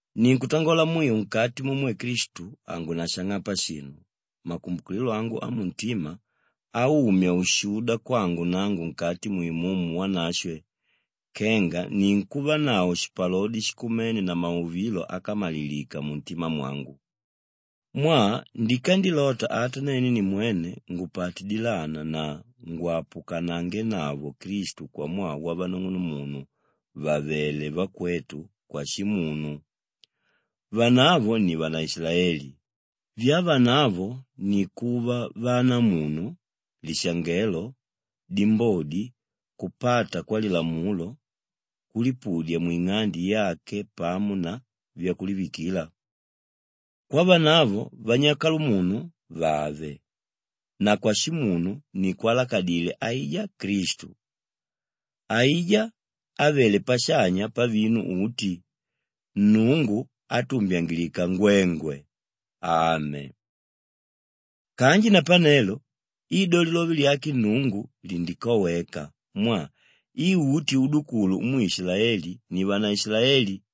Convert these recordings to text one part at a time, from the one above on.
Ninkutangola mwiu nkati mumwe Klistu hangunashang'apa shinu, makumbukililo angu amuntima aumya ushuda kwangu nangu nkati mu Imumu Wanashwe kenga ninkuvanavo shipalodi shikumene na mauvilo ákamalilika muntima mwangu. Mwaa ndikandilota ata nene nimwene ngupate dilana na ngwapukanangenavo Klistu kwamwaa wavanung'unumunu vàvele vakwetu kwashimunu. Vanavo ni vanaishilaeli; vyavanavo ni kuva vanamunu, lishangelo, dimbodi, kupata kwalilamulo, kulipudya mwing'ande yake pamo na vyakulivikila. Kwavanavo vanyakalamunu vàve na kwashimunu ni kwálakadile aijá Klistu, aijá ávele pashanya pavinu uti, Nnungu átumbyangilika ngwengwe! Ame. Kanji napanelo i do lilove lyake Nnungu lindikoweka mwaa i uti udukulu umwe Ishilaeli ni vanaishilaeli,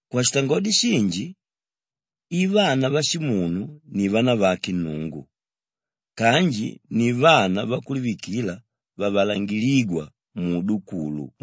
Kwashitangodi shinji, i vana vashimunu ni vanavake Nnungu kanji ni vana vakulivikila vavalangilígwa muudukulu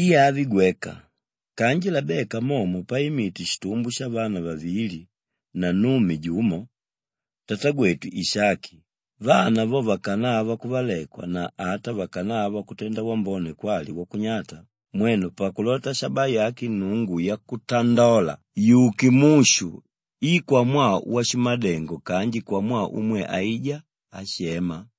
I avi gweka kanji Labeka momo paimite shitumbo shavana vavili na nnume jumo, tatagwetu Ishaki, vana vo vakanava kuvalekwa na ata vakanava kutenda wambone kwali wakunyata, mwenu pakulota shabaa yake Nnungu yakutandola yuke mushu i kwamwaa washimadengo kanji kwamwaa umwe aijá áshema,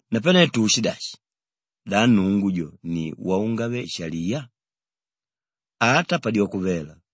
Napane tuushidashi? Da Nnungu jo ni waungave-shaliya? Ata padyoko vela!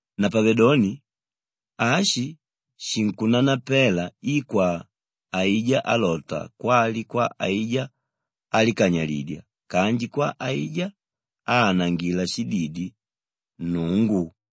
Napavedoni, ashi shinkunanapela i kwa aijá álota kwali kwa aijá álikanyalidya kanji kwa aijá áanangila shididi, Nnungu.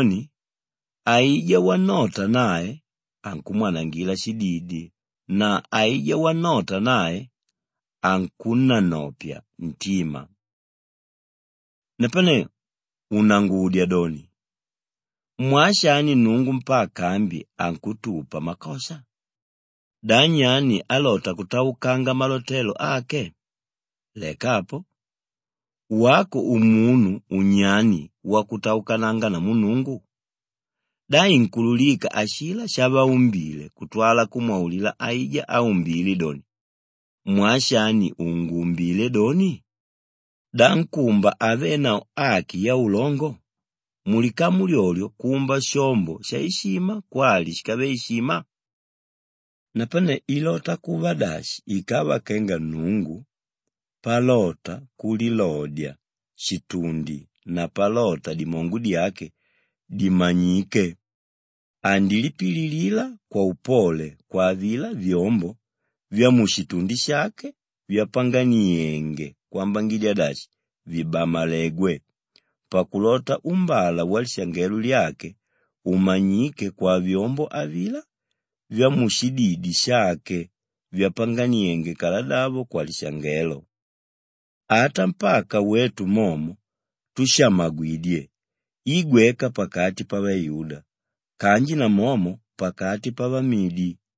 Napavedoni aijá wannota nae, ankumwanangila shididi na aijá wannota nae, ankunnanopya ntima. Napane unangudya doni, “Mwaa shani Nnungu mpaka ambi ankutupa makosha? Da nyani álota kutaukanga malotelo ake?” Leka apo, wako umunu unyani wakutaukananga namu Nnungu? Da inkuululika ashilá shavaumbile kutwala kumwaulila aijá áumbile doni, “Mwaa shani unguumbile doni?” Da nkúmba havenavo aki yaulongo, mulikamu lyolyo kumba shombo shaishima kwali shíkave ishima? Napane ilota kuva dashi ikava kenga Nnungu palota kulilodya shitundi na palota dimongo dyake dimanyike andilipililila kwaupole kwa avilá vyombo vyamushitundi shake vyapanganienge kwambangidya dashi vibamalegwe pakulota uumbala walishangelo lyake umanyike kwavyombo avilá vyamushididi shake vyapanganienge kaladavo kwalishangelo, ata mpaka wetu momo túshamagwidye i gweka pakati pavayuda kanji namomo pakati pavamidi.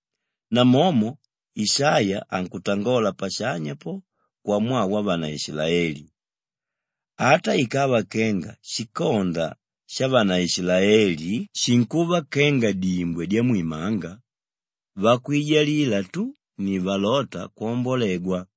Namomo Ishaiya ankutangola pashanya po kwamwaa wavanaishilaeli, “Ata ikava kenga shikonda shavanaishilaeli shinkuva kenga dimbwe dyamwimanga, vakwijalila tu ni valóta kwambolegwa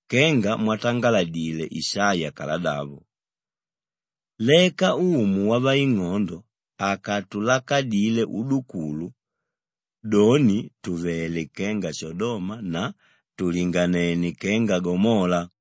Kenga mwatangaladile Ishaiya kaladavo, “Leka Umu Wavaing'ondo akatulakadile udukulu, doni tùvele kenga Shodoma na tùlinganene kenga Gomola.”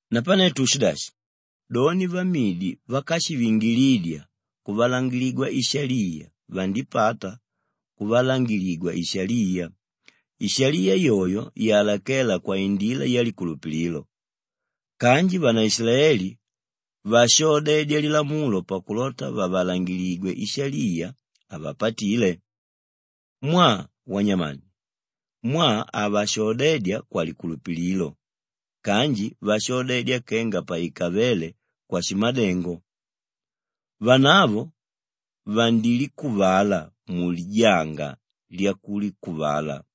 Napane tuushidashi? Doni vamidi vákashivingilidya kuvalangiligwa ishaliya vandipata kuvalangiligwa ishaliya, ishaliya yoyo yalakéla kwaindila yalikulupililo kanji vanaishilaeli váshoodedya lilamulo pakulota vavalangiligwe ishaliya, havapatile. Mwaa wanyamani? Mwaa havashoodedya kwalikulupililo kanji vashoodedya kenga paikavéle kwashimadengo. Vanavo vandilikuvala mulijanga lyakulikuvala.